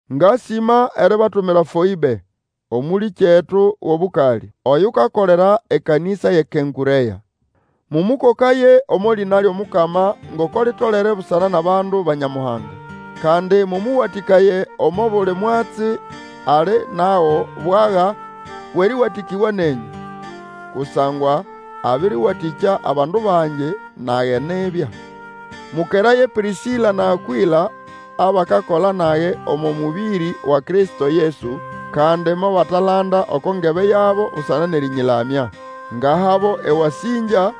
Ngasĩma eribatumira Foĩbe, Omũlĩkyetu wʼobũkalĩ, oyukakolera ekanĩsa yʼeKenkũrea. Mũmũkokaye omo lĩna lyʼomukama ngoko litolere busana nʼabandu ba Nyamuhanga, Kandi mũmũwatĩkaye omo buli mwatsi ali nago bwaga bwʼerĩwatĩkĩbwa nenyũ. Kusangwa abĩrĩwatĩkya abandu bangi, nage nibya. Mũkeraye Pĩrĩsĩla na Akwĩla abakakola nage omo mũbĩrĩ wa Kristo Yesu, kandi mobatalanda oko ngebe yabo busana nʼerĩnyĩlamya. Ngahabo ewasĩngya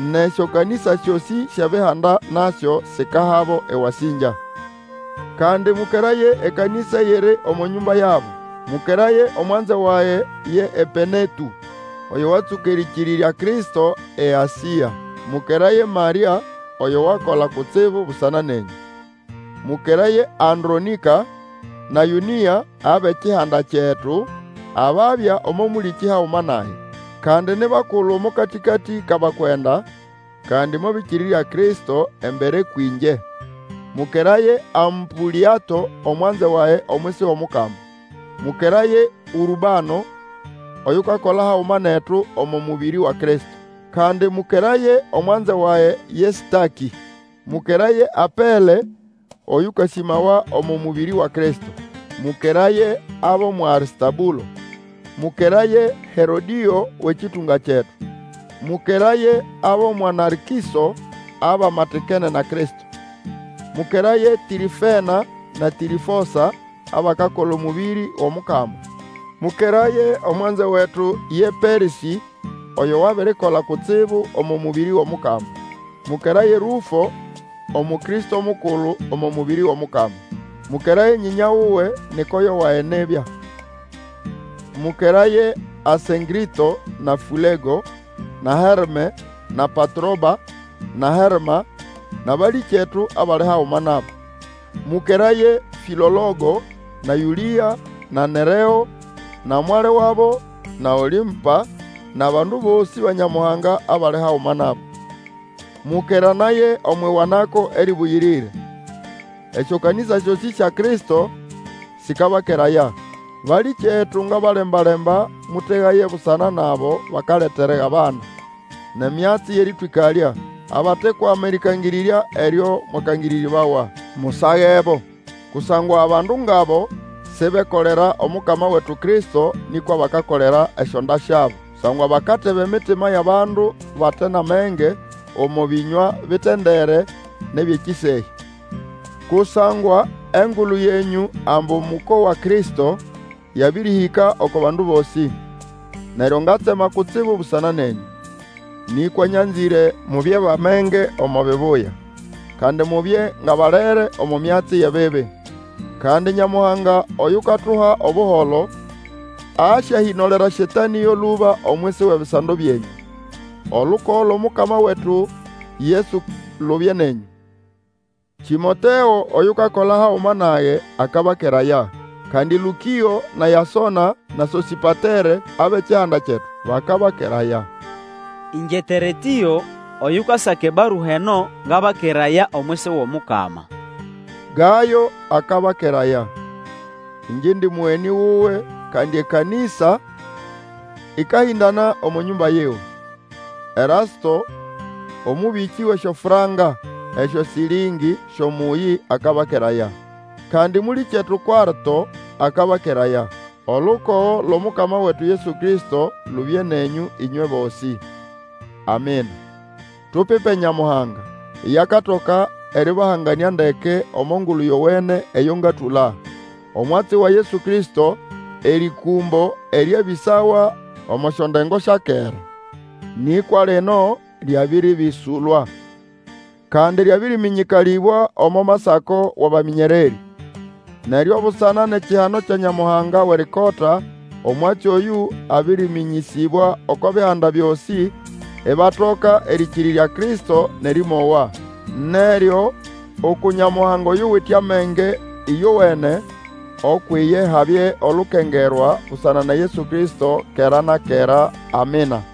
nʼesyokanĩsa syosĩ syʼEbihanda nasyo sikahabo ewasĩngya. Kandi mũkeraye ekanĩsa eyiri omo nyũmba yabo. Mũkeraye omwanze wage ye Epenetũ, oyo watsũka erĩkĩrĩrya Kristo eAsĩa. Mũkeraye Marĩa oyo wakola kutsibu busana nenyũ. Mũkeraye Andronĩka na Yũnĩa abʼekihanda kyetu, ababya omo mũlĩkĩ haguma nage. Kandi ni bakulu omo katĩkatĩ kʼabakwenda, kandi mobĩkĩrĩrya Kristo embere kwĩngye. Mũkeraye Ampũlĩato omwanzewage omwisi wʼOmukama. Mũkeraye Ũrbano, oyukakola haguma netu omo mũbĩrĩ wa Kristo. Kandi mũkeraye omwanze wage ye Stakĩ. Mũkeraye Apele Oyũkasĩmawa omo mũbĩrĩ wa Kristo. Mũkeraye abʼomwa Arĩstabũlo. Mũkeraye Herodĩo wʼekĩtũnga kyetu. Mũkeraye abʼomwa Narkĩso, abamatikene na Kristo. Mũkeraye Tĩrĩfena na Tĩrĩfosa, abakakola omũbĩrĩ wʼOmukama. Mũkeraye omwanze wetu ye Persĩ, oyo wabirikola kutsibu omo mũbĩrĩ wʼOmukama. Mũkeraye Rũfo, Omukristo mukulu omo mũbĩrĩ wʼOmukama. Mũkeraye nyĩnya wuwe, ni koyo wage nibya. Mũkeraye Asĩnkrĩto na Fũlego, na Herme, na Patroba, na Herma, nʼabalĩkyetu abali haguma nabo. Mũkeraye Fĩiologo, na Yũlĩa, na Nereo, na mwali wabo na Olĩmpa, nʼabandu bosĩ ba Nyamuhanga abali haguma nabo. Mũkeranaye omwʼiwanako erĩbũyĩrĩre. Esyokanĩsa syosĩ sya Kristo sĩkabakeraya. Balĩkyetu, ngabalemba-lemba, mũtegaye busana nʼabo bakaleta erigabana, nʼemyatsi yʼerĩtwĩkalya, abatekwama erĩkangĩrĩrya eryo mwakangĩrĩrĩbawa. Musagebo. Kusangwa abandu ngʼabo sibekolera Omukama wetu Kristo, nĩkwa bakakolera esyonda syabo. Kusangwa bakateba emitima yʼabandu bate nʼamenge, omo bĩnywa bitendere nʼebyʼekĩsehya. Kusangwa engulu yenyũ ambu mũkowa Kristo, yabĩrĩhĩka oko bandu bosĩ; neryo ngatsema kutsibu busana nenyũ. Nĩkwa nyanzĩre mubye bʼamenge omo bibuya, kandi mubye ngʼabalere omo myatsi yʼebibi. Kandi Nyamuhanga oyukatuha Obuholo, asyahĩnolera Satanĩ yo lũba omwisi wʼebisando byenyũ. Olukogo lwʼOmukama wetu Yesu lubye nenyũ. Tĩmoteo oyukakola haguma nage akabakeraya; kandi Lũkĩo na Yasona, na Sosĩpatere abʼekihanda kyetu, bakabakeraya. Ĩngye Teretĩo, oyukasaka ebarua eno, ngabakeraya omwisi wʼOmukama. Gayo akabakeraya. Ĩngye indi mũgenĩ wuwe, kandi ekanĩsa ĩkahĩndana omo nyũmba yiwe. Erasto omũbĩkĩ wʼesyofranka (esyoshĩllĩng) syʼomũyĩ akabakeraya. Kandi mũlĩkyetu Kwarto akabakeraya. [ Olukogo lwʼOmukama wetu Yesu Kristo lubye nenyũ ĩnywe bosĩ. Amina.] Tupipe Nyamuhanga! Iye akatoka erĩbahanganĩa ndeke omo Ngulu Yowene eyo ngatũla, omwatsi wa Yesu Kristo, erĩkũmbo eryabĩsawa omo syondengo sya kera. Nĩkwa lino lyabĩrĩbĩsũlwa, kandi lyabĩrĩmĩnyĩkalĩbwa omo Masako wʼabamĩnyererĩ. Neryo busana nʼekihano kya Nyamuhanga Wʼerikota, omwatsi oyũ abĩrĩmĩnyĩsĩbwa oko bihanda byosĩ, ibatoka erĩkĩrĩrya Kristo nʼerĩmowa. Neryo uku Nyamuhanga oyuwite amenge ĩyowene, ukwʼiye habye olukengerwa busana na Yesu Kristo, kera na kera! Amina.